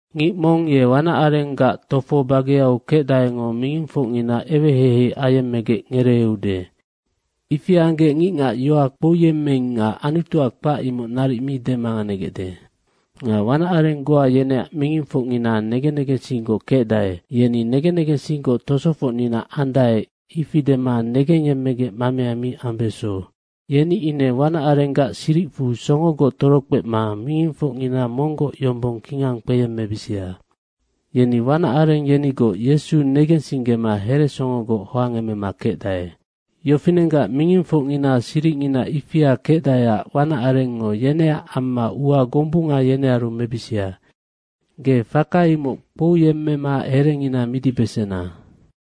Mong ye wanac arenggac tofo bageau kecdaengo mingingfocngina eweheihei ayemmegec ngereeude. Ifi anggec ngicngac yoac kpouyemmeing nga Anutuac kpac, imoc naric mi demanganegecde. Nga wanac areng goa yeneac mingingfocngina negen negensinggoc kecdae. Yeni negen negensinggoc tosofocnina andae, ifi dema negengyemmegec mamea mi ambeso. Yeni ine wanac arenggac siricfu songogoc torokpema mingingfocngina monggoc yombong kingang kpeyemmebisia. Yeni wanac areng yenigoc Yesu negensinggema heresongogoc hoangemema kecdae. Yofinenggac mingingfocngina siricngina ifia kecdaeac, wanac arengngo yeneac amma ua gombunga yenearu mebisia. Ge faka imoc kpouyemmema herengina midibesena.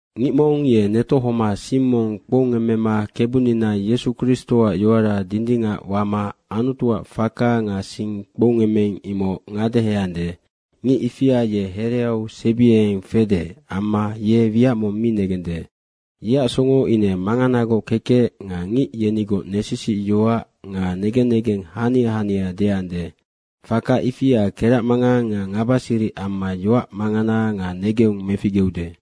Ngic mong ye netohoma sing mong kpoungemmema Kebunina Yesu Kristoac yoara dindingac wama Anutuac faka nga sing kpoungemmeing, imoc ngadeheande, ngic ifia ye hereau sebiengeng fede amma ye wiac mong mi negende. Yeac songo ine manganagoc kekec nga ngic yenigoc nesisic yoac nga negen negeng hania hania deande, faka ifia keracmangang nga ngabasiric amma yoac mangana nga negeung meficgeude.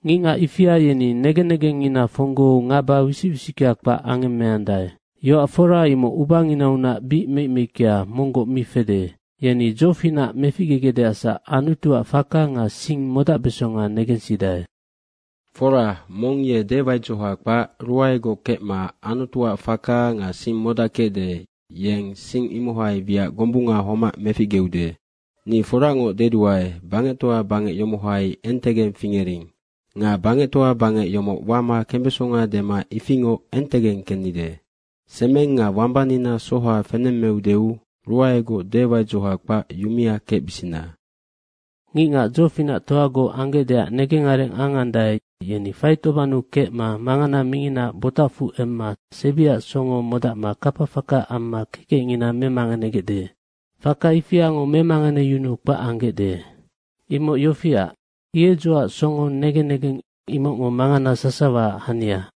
Ngicngac ifia yeni negen negengngina fonggou ngaba wisic wisickea kpac angemeandae. Yoac fora imoc ubanginaunac bic meic meickea, monggoc mi fede. Yeni dzofinac meficgegecdeacsac Anutuac faka nga sing modacbesonga negensidae. Fora, mong ye dewaidzoha kpac ruaegoc kecma Anutuac faka nga sing modackecde, yeng sing imohai wiac gombunga homac meficgeude. Ni foracngoc deduae, bangectoa bangec yomohai entegeng fingering. Nga bangectoa bangec yomoc wama kembesonga dema ifingoc entegeng kennide. Semeng nga wambanina soha fenemmeudeu ruaegoc dewaidzoha kpac yumia kecbisina. Ngicngac dzofinactoagoc anggecdeac negengareng angandae, yeni faitobannu kecma mangana minginaac botacfu emma sebiac songo modacma kapa faka amma kekecngina memanganegecde. Faka ifiango memanganeyunuu kpac anggecde. Imoc yofiac, hiedzoac songo negen negeng, imocngo mangana sasawaac hania.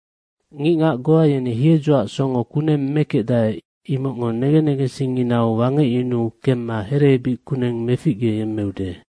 Ngicngac goa yeni hiedzoac songo kuneng mekecdae, imocngo negen negensingnginau wangecyunuu kemma hereebic kuneng meficgeyemmeude.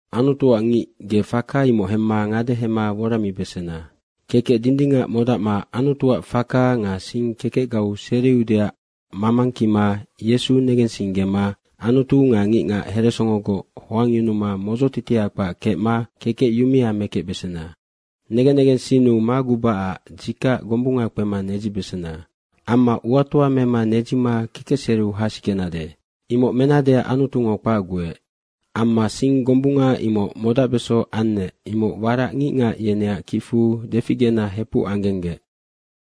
Anutuac ngic, ge faka imoc hemma ngadehema woramibesena. Kekec dindingac modacma Anutuac faka nga sing kekecgau seriudeac mamangkima Yesu negensinggema Anutu nga ngicngac heresongogoc hoangyunuma modzotitia kpac kecma kekec yumea mekecbesena. Negen negensinnu magubacac dzikac gombunga kpema nedzibesena. Amma uatoa mema nedzima kekecseriu hasikenade. Imoc menadeac Anutungo kpacguec. Amma sing gombunga imoc modacbeso annec, imoc warac ngicngac yeneac kicfu deficgena hepuc anggenggec.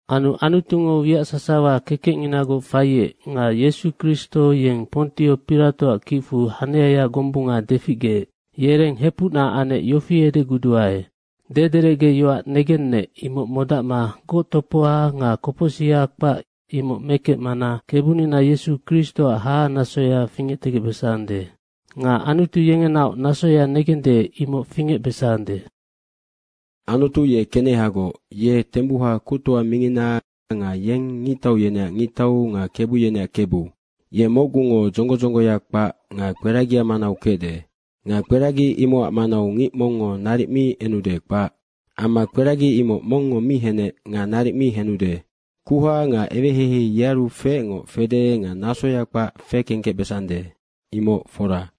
Anu Anutungo wiac sasawa kekecnginagoc faiec nga Yesu Kristo yeng Pontio Piratoac kicfu haniaya gombunga deficgeec, yereng hepucna anec yofi edeguduae, dederecgeyoac negennec, imoc modacma goctopoha nga kopocsiha kpac, imoc mekecmana Kebunina Yesu Kristoac hahanasoya fingectegecbesande. Nga Anutu yengenaoc nasoya negende, imoc fingecbesande. Anutu ye kenehagoc ye tembuha Kuctoa mingina nga yeng ngictau yeneac Ngictau nga kebu yeneac Kebu. Ye mocgungo dzonggo dzongoya kpac nga kperagia manau kecde. Nga kperagi imocac manau ngic mongngo naric mi enude, kpac. Amma kperagi imoc mongngo mi henec nga naric mi henude. Kuha nga eweheihei yearu feecngo fede nga nasoya kpac fekengkecbesande. Imoc fora.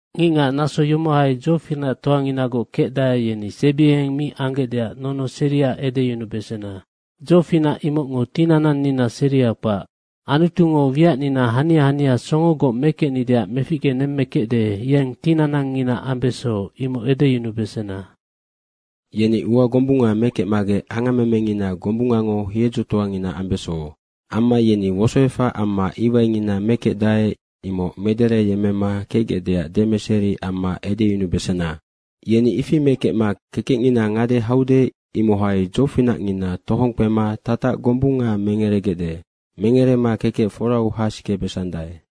Ngicngac naso yomohai dzofinactoanginagoc kecdae, yeni sebiengeng mi anggecdeac nonoseria edeyunubesena. Dzofinac imocngo tinanannina seria kpac. Anutungo wiacnina hania hania songogoc mekecnideac meficgenemmekecde, yeng tinanangngina ambeso, imoc edeyunubesena. Yeni ua gombunga mekecmagec angammemengina gombungango hiedzotoangina ambeso. Amma yeni wosoefac amma iwaingina mekecdae, imoc medereyemmema kecgecdeac demeseri amma edeyunubesena. Yeni ifi mekecma kekecngina ngade haude, imohai dzofinacngina tohong kpema tatac gombunga mengeregecde. Mengerema kekec forau hasikebesandae.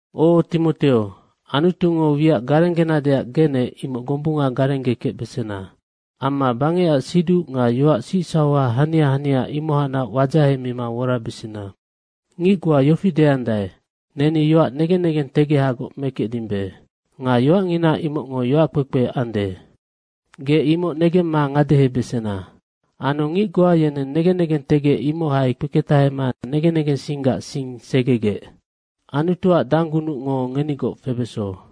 O, Timoteo, Anutungo wiac garenggenadeac genec, imoc gombunga garenggekecbesena. Amma bangecac siduc nga yoac sicsauha hania hania, imohacnac wadzahemima worabesena. Ngic goa yofi deandae, “Neni yoac negen negengtegehagoc mekecdimbe.” nga yoacngina imocngo yoac kpekpe ande. Ge imoc negemma ngadehebesena. Anu ngic goa yeneng negen negentegec imohai kpeketahema negen negensinggac sing segegec. Anutuac danggunucngo ngenigoc febeso.